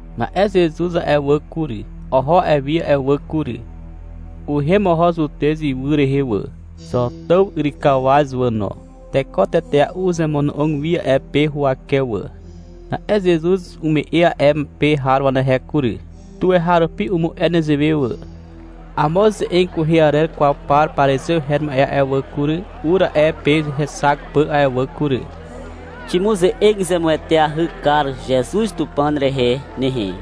Na'e Zezuz a'e wà kury, oho a'e wi a'e wà kury. Uhem oho Zutez ywy rehe wà, Zotàw yrykawaz wà no. Teko tetea'u uzemono'og wi a'e pe huwake wà. Na'e Zezuz umu'e a'e pe har wà kury. Tuweharupi umu'e nezewe wà. Amo ze'eg kwehe arer kwaw par parizew her ma'e a'e wà kury, ur a'e pe hexak pà a'e wà kury. Ximuze'eg zemueteahy kar Zezuz Tupàn rehe nehe,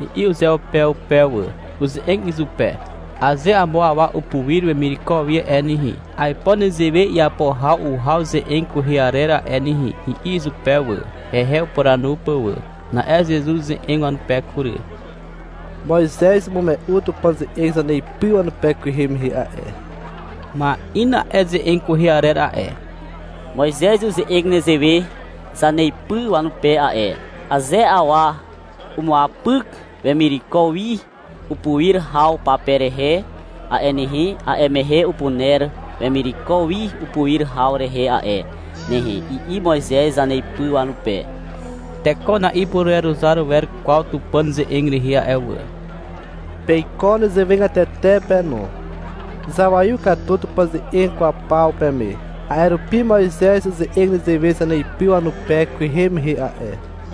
i'i uzeupeupe wà. Uze'eg izupe. — Aze amo awa upuir wemireko wi a'e nehe, aipo nezewe iapo haw uhaw ze'eg kwehe arer a'e nehe, i'i izupe wà, hehe upuranu pà wà. Na'e Zezuz uze'eg wanupe kury. — Moizez umume'u Tupàn ze'eg zaneipy wanupe kwehe mehe a'e. Ma'in a'e ze'eg kwehe arer a'e. Moizez uze'eg nezewe zaneipy wanupe a'e. Aze awa umuapyk wemireko wi upuir haw pape rehe a'e nehe, a'e mehe upuner wemireko wi upuir haw rehe a'e nehe, i'i Moizez zaneipy wanupe. Teko na'ipureruzar wer kwaw Tupàn ze'eg rehe a'e wà. Peiko nezewegatete pe no. Zawaiw katu Tupàn ze'eg kwaw paw peme. A'e rupi Moizez uze'eg nezewe zaneipy wanupe kwehe mehe a'e.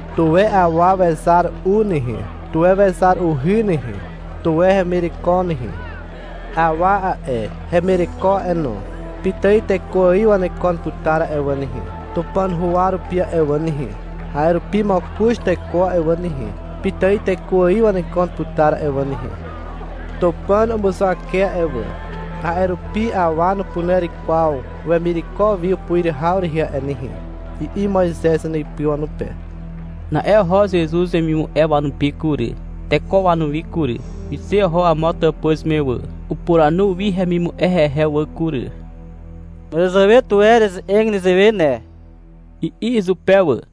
Tuwe awa wezar u nehe, tuwe wezar uhy nehe, tuwe hemireko nehe. Awa a'e, hemireko a'e no, pitài teko ài wanekon putar a'e wà nehe, Tupàn huwa rupi a'e wà nehe. A'e rupi mokoz teko a'e wà nehe, pitài teko ài wanekon putar a'e wà nehe. Tupàn umuzuwake a'e wà. A'e rupi awa nupuner kwaw wemireko wi upuir haw rehe a'e nehe, i'i Moizez zaneipy wanupe. Na'e oho Zezuz wemimu'e wanupi kury, teko wanuwi kury. Wixe oho amo tàpuz me wà. Upuranu wi hemimu'e hehe wà kury. — Màràzàwe tuwe ereze'eg nezewe ne, i'i izupe wà.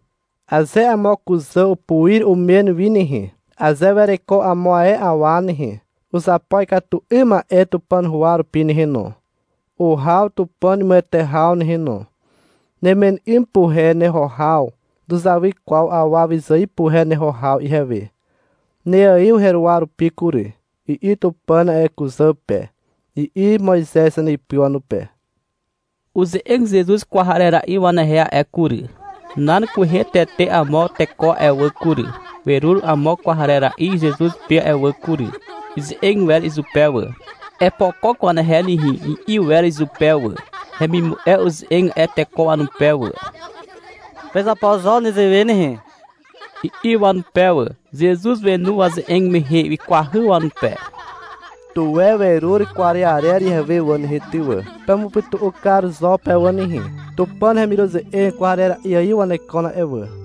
Aze amo kuzà upuir umen wi nehe, aze wereko amo ae awa nehe, uzapo ikatu 'ym ma'e Tupàn huwa rupi nehe no, uhaw Tupàn imuwete haw nehe no. — Nemen 'ym puhe neho haw nuzawy kwaw awa wyzài puhe neho haw ihewe. Neaiw heruwa rupi kury, i'i Tupàn a'e kuzà pe, i'i Moizez zaneipy wanupe. Uze'eg Zezuz kwarera'i wanehe a'e kury. Nan kwehe tete amo teko a'e wà kury, werur amo kwarera'i Zezuz pe a'e wà kury. Ize'eg wer izupe wà. — Epokok wanehe nehe, i'i wer izupe wà. Hemimu'e uze'eg a'e teko wanupe wà. — Pezapo zo nezewe nehe, i'i wanupe wà. Zezuz wenu waze'eg mehe. Wikwahy wanupe. Tuwe werur kwarearer ihewe wà nehe, ty wà. Pemupytu'u kar zo pe wà nehe. Tupàn hemiruze'eg kwarera'i ài wanekon a'e wà.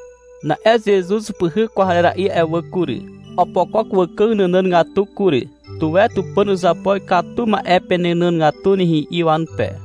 Na'e Zezuz upyhyk kwarera'i a'e wà kury. Opokok wàkàg nànàgatu kury. — Tuwe Tupàn uzapo ikatu ma'e penànàgatu nehe, i'i wanupe.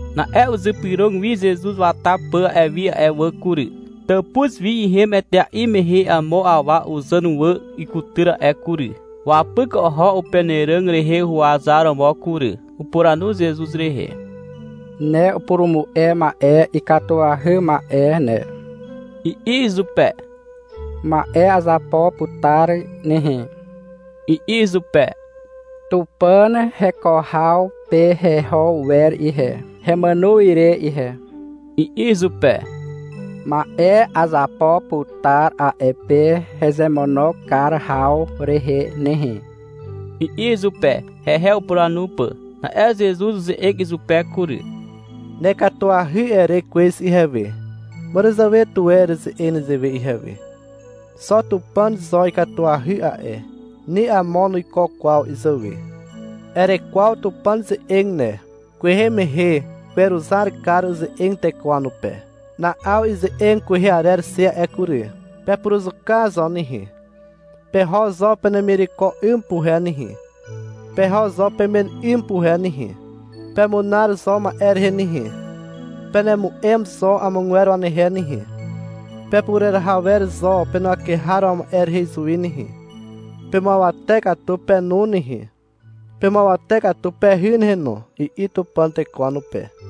Na'e uzypyrog wi Zezuz wata pà a'e wi a'e wà kury. Tàpuz wi ihem etea'i mehe amo awa uzàn wà ikutyr a'e kury. Wapyk oho upenàràg rehe huwazaromo kury. Upuranu Zezuz rehe. — Ne upurumu'e ma'e ikatuahy ma'e ne, i'i izupe. — Ma'e azapo putar nehe, i'i izupe. — Tupàn heko haw pe heho wer ihe, hemàno re ihe, i'i izupe. — Ma'e azapo putar a'e pe hezemono kar haw rehe nehe, i'i izupe, hehe upuranu pà. Na'e Zezuz uze'eg izupe kury. Nekatuahy, ere kwez ihewe. Màràzàwe tuwe ereze'eg nezewe ihewe. Xo Tupàn zo ikatuahy a'e, ni amo nuiko kwaw izàwe. Erekwaw Tupàn ze'eg ne. Kwehe mehe weruzar kar uze'eg teko wanupe. Na'aw ize'eg kwehe arer xe a'e kury. Pepuruzuka zo nehe. Peho zo penemireko 'ym puhe nehe, peho zo pemen 'ym puhe nehe. Pemunar zo ma'e rehe nehe. Penemu'em zo amogwer wanehe nehe. Pepureraha wer zo penuwake har ma'e rehe izuwi nehe, pemuawate katu penu nehe, pemuawate katu pehy nehe no, i'i Tupàn teko wanupe.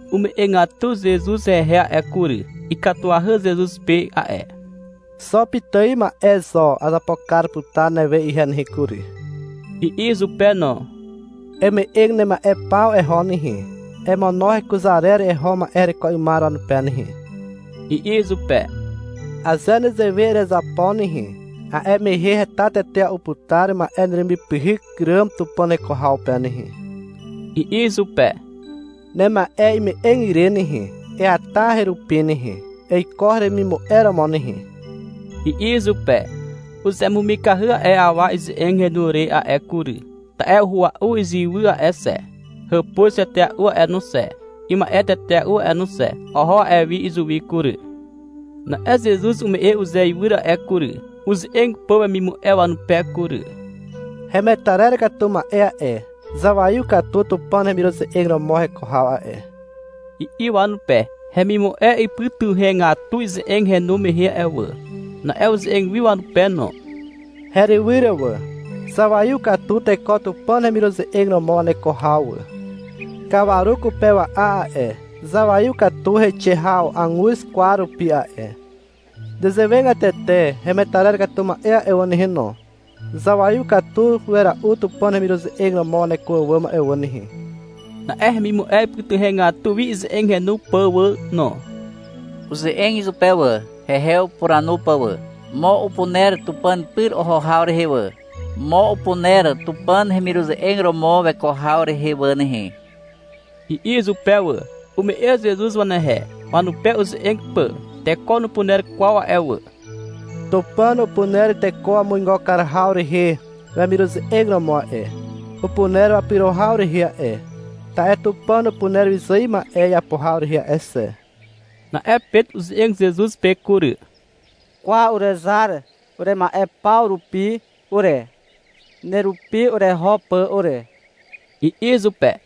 Ume'egatu Zezuz hehe a'e kury. Ikatuahy Zezuz pe a'e. — Xo pitài ma'e zo azapo kar putar newe ihe nehe kury, i'i izupe no. — Eme'eg nema'e paw eho nehe. Emono hekuzarer eho ma'e hereko 'ymar wanupe nehe, i'i izupe. — Aze nezewe erezapo nehe, a'e mehe heta tetea'u putar ma'e neremipyhyk ràm Tupàn heko haw pe nehe, i'i izupe. — Nema'e ime'eg ire nehe, eata herupi nehe. Eiko heremimu'e romo nehe, i'i izupe. Uzemumikahy a'e awa ize'eg henu re a'e kury. Ta'e uhua'u iziwy a'e xe, hàpuz tetea'u a'e no xe, ima'e tetea'u a'e no xe. Oho a'e wi izuwi kury. Na'e Zezuz ume'e uzeiwyr a'e kury, uze'eg pà wemimu'e wanupe kury. — Hemetarer katu ma'e a'e, zawaiw katu Tupàn hemiruze'eg romo heko haw a'e, i'i wanupe. Hemimu'e ipytuhegatu ize'eg henu mehe a'e wà. Na'e uze'eg wi wanupe no. — Herywyr wà, zawaiw katu teko Tupàn hemiruze'eg romo waneko haw wà. Kawaru kupewa'a a'e, zawaiw katu heixe haw aguz kwar rupi a'e. Nezewegatete hemetarer katu ma'e a'e wà nehe no, zawaiw katu wera'u Tupàn hemiruze'eg romo waneko àwàm a'e wà nehe. Na'e hemimu'e ipytuhegatu wi ize'eg henu pà wà no. Uze'eg izupe wà, hehe upuranu pà wà. — Mo upuner Tupàn pyr oho haw rehe wà. Mo upuner Tupàn hemiruze'eg romo weko haw rehe wà nehe, i'i izupe wà. Ume'e Zezuz wanehe, wanupe uze'eg pà. — Teko nupuner kwaw a'e wà, Tupàn upuner teko wamuigo kar haw rehe wemiruze'eg romo a'e, upuner wapyro haw rehe a'e. Ta'e Tupàn upuner wyzài ma'e iapo haw rehe a'e xe. Na'e Pet uze'eg Zezuz pe kury. — Kwa, urezar urema'e paw rupi ure, nerupi ureho pà ure, i'i izupe.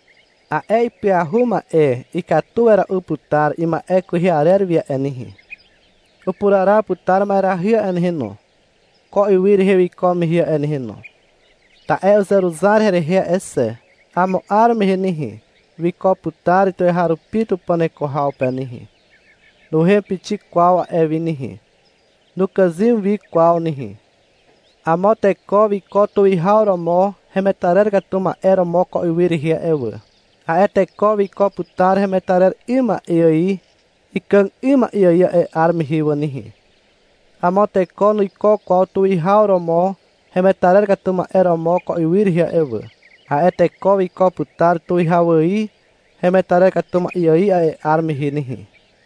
A'e ipyahu ma'e ikatu wera'u putar ima'e kwehe arer wi a'e nehe. Upuraraw putar ma'erahy a'e nehe no, ko ywy rehe wiko mehe a'e nehe no. Ta'e uzeruzar herehe a'e xe. Amo 'ar mehe nehe, wiko putar tuweharupi Tupàn heko haw pe nehe. Nuhem pixik kwaw a'e wi nehe. Nukàzym wi kwaw nehe. Amo teko wiko tuwihaw romo hemetarer katu ma'e romo ko ywy rehe a'e wà. A'e teko wiko putar hemetarer 'ym ma'e ài ikàg 'ym ma'e ài a'e 'ar mehe wà nehe. Amo teko nuiko kwaw tuwihaw romo hemetarer katu ma'e romo ko ywy rehe a'e wà. A'e teko wiko putar tuwihaw ài hemetarer katu ma'e ài a'e 'ar mehe nehe.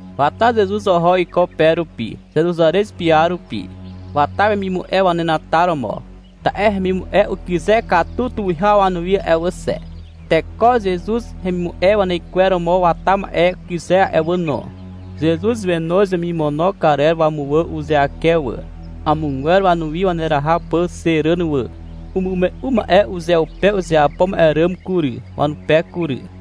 Wata Zezuz oho iko pe rupi, Zeruzarez piar rupi. Wata wemimu'e wanenataromo. Ta'e hemimu'e ukyze katu tuwihaw wanuwi a'e wà xe. Teko Zezuz hemimu'e wanaikweromo wata ma'e ukyze a'e wà no. Zezuz wenoz wemimono karer wamuwà uzeake wà, amogwer wanuwi waneraha pà xe ràn wà. Umume'u ma'e uzeupe uzeapo ma'e ràm kury, wanupe kury.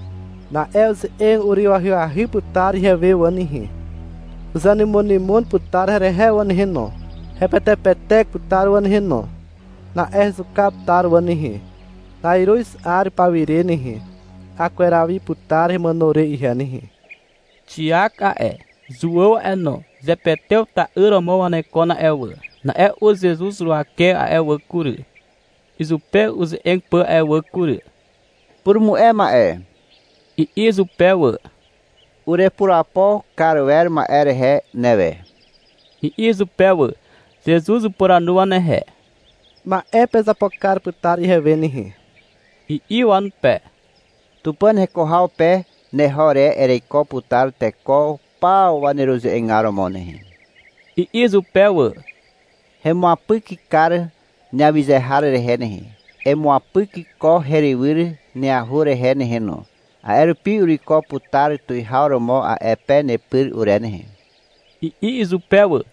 Na'e uze'eg uryw ahyahy putar ihewe wà nehe. Uzenymonymon putar herehe wà nehe no. Hepetepetek putar wà nehe no. Na'e hezuka putar wà nehe. Na'iruz 'ar paw ire nehe, akweraw wi putar hemàno re ihe nehe. Xiak a'e, Zuàw a'e no, Zepetew ta'yr romo wanekon a'e wà. Na'e ur Zezuz huwake a'e wà kury, izupe uze'eg pà a'e wà kury. — Purumu'e ma'e, i'i izupe wà. — Urepurapo kar wer ma'e rehe newe, i'i izupe wà. Zezuz upuranu wanehe. — Ma'e pezapo kar putar ihewe nehe, i'i wanupe. — Tupàn heko haw pe neho re ereiko putar teko paw waneruze'egar romo nehe, i'i izupe wà. — Hemuapyk kar neawyze har rehe nehe. Emuapyk ko herywyr neahur rehe nehe no, a'e rupi uruiko putar tuwihaw romo a'e pe nepyr ure nehe, i'i izupe wà.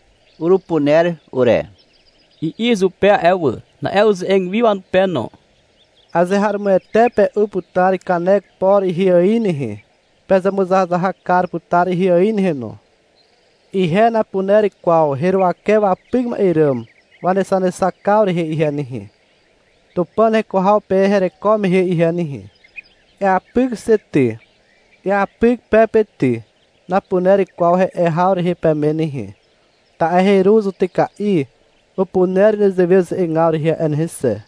— Urupuner ure, i'i izupe a'e wà. Na'e uze'eg wi wanupe no. — Azeharomoete pe'u putar kanek por ihe ài nehe, pezemuzahazahak kar putar ihe ài nehe no. Ihe napuner kwaw heruwake wapyk ma'e ràm wanexanexakaw rehe ihe nehe, Tupàn heko haw pe hereko mehe ihe nehe. — Eapyk xe ty, eapyk pe pe ty, napuner kwaw he'e haw rehe peme nehe, ta'e heru zutyka'i upuner nezewe uze'egaw rehe a'e nehe xe.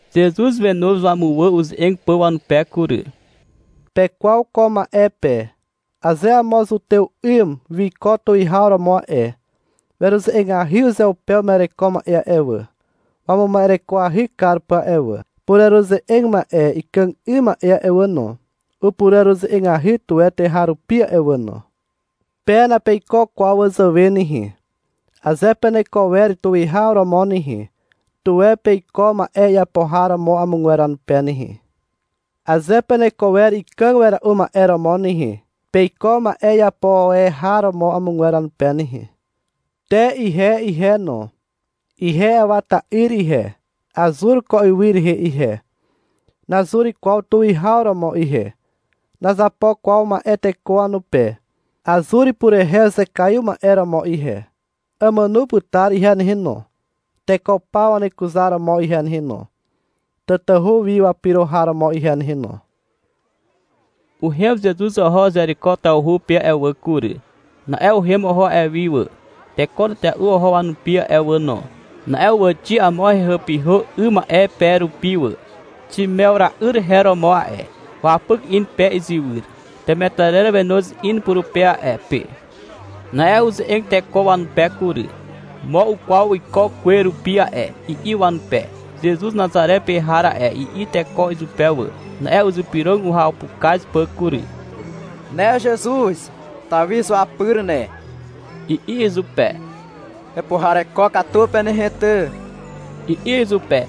Zezuz wenoz wamuwà uze'eg pà wanupe kury. — Pekwaw ko ma'e pe. Aze amo zutew 'ym wiko tuwihaw romo a'e, weruze'egahy uzeupe uma'ereko ma'e a'e wà, wamuma'erekoahy kar pà a'e wà. Pureruze'eg ma'e ikàg ma'e a'e wà no, upureruze'egahy tuwe tuweharupi a'e wà no. Pe napeiko kwaw wazàwe nehe. Aze peneko wer tuwihaw romo nehe, tuwe peiko ma'e iapo har romo amogwer wanupe nehe. Aze peneko wer ikàg wera'u ma'e romo nehe, peiko ma'e iapo e har romo amogwer wanupe nehe. Te ihe ihe no. Ihe Awa ta'yr ihe. Azur ko ywy rehe ihe. Nazur kwaw tuwihaw romo ihe. Nazapo kwaw ma'e teko wanupe. Azur purehe uzekaiw ma'e romo ihe. Amàno putar ihe nehe no, teko paw wanekuzar romo ihe nehe no, tatahu wi wapyro har romo ihe nehe no. Uhem Zezuz oho Zeriko tawhu pe a'e wà kury. Na'e uhem oho a'e wi wà. Teko tetea'u oho wanupi a'e wà no. Na'e uwàxi amo hehàpyhà 'ym ma'e pe rupi wà. Ximewra'yr her romo a'e. Wapyk in pe izywyr. Temetarer wenoz in purupe a'e pe. Na'e uze'eg teko wanupe kury. — Mo ukwaw iko kwe rupi a'e, i'i wanupe. — Zezuz Nazare pe har a'e, i'i teko izupe wà. Na'e uzypyrog uhapukaz pà kury. — Ne Zezuz, Tawi izuapyr ne, i'i izupe. — Hepuhareko katu pe nehe ty, i'i izupe.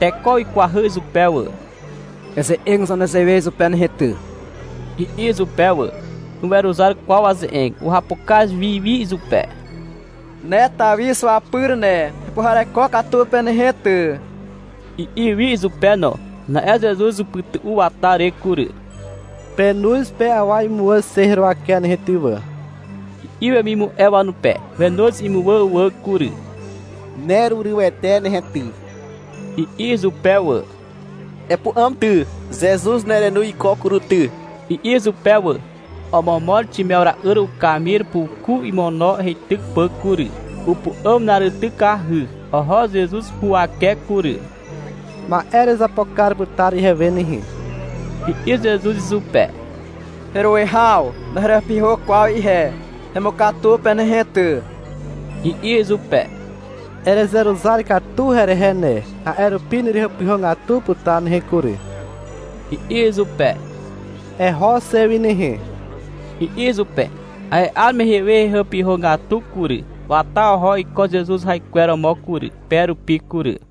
Teko wikwahy izupe wà. — Eze'eg zo nezewe izupe nehe ty, i'i izupe wà. Nuweruzar kwaw waze'eg. Uhapukaz wi wi izupe. — Ne Tawi izuapyr ne, hepuhareko katu pe nehe ty, i'i wi izupe no. Na'e Zezuz upytu'u wata re kury. — Penoz pe awa imuwà xe heruwake nehe ty wà, i'i wemimu'e wanupe. Wenoz imuwà wà kury. — Nerurywete nehe ty, i'i izupe wà. — Epu'àm ty, Zezuz nerenoz iko kury ty, i'i izupe wà. Omomor Ximewra'yr ukamir puku imono heityk pà kury. Upu'àm na'aritykahy. Oho Zezuz huwake kury. — Ma'e erezapo kar putar ihewe nehe, i'i Zezuz izupe. — Heruwihaw, naherehàpyhà kwaw ihe, hemukatu pe nehe ty, i'i izupe. — Erezeruzar katu herehe ne, a'e rupi nerehàpyhàgatu putar nehe kury, i'i izupe. — Eho xe wi nehe, i'i izupe. A'e 'ar mehe we hehàpyhàgatu kury. Wata oho iko Zezuz raikwer romo kury, pe rupi kury.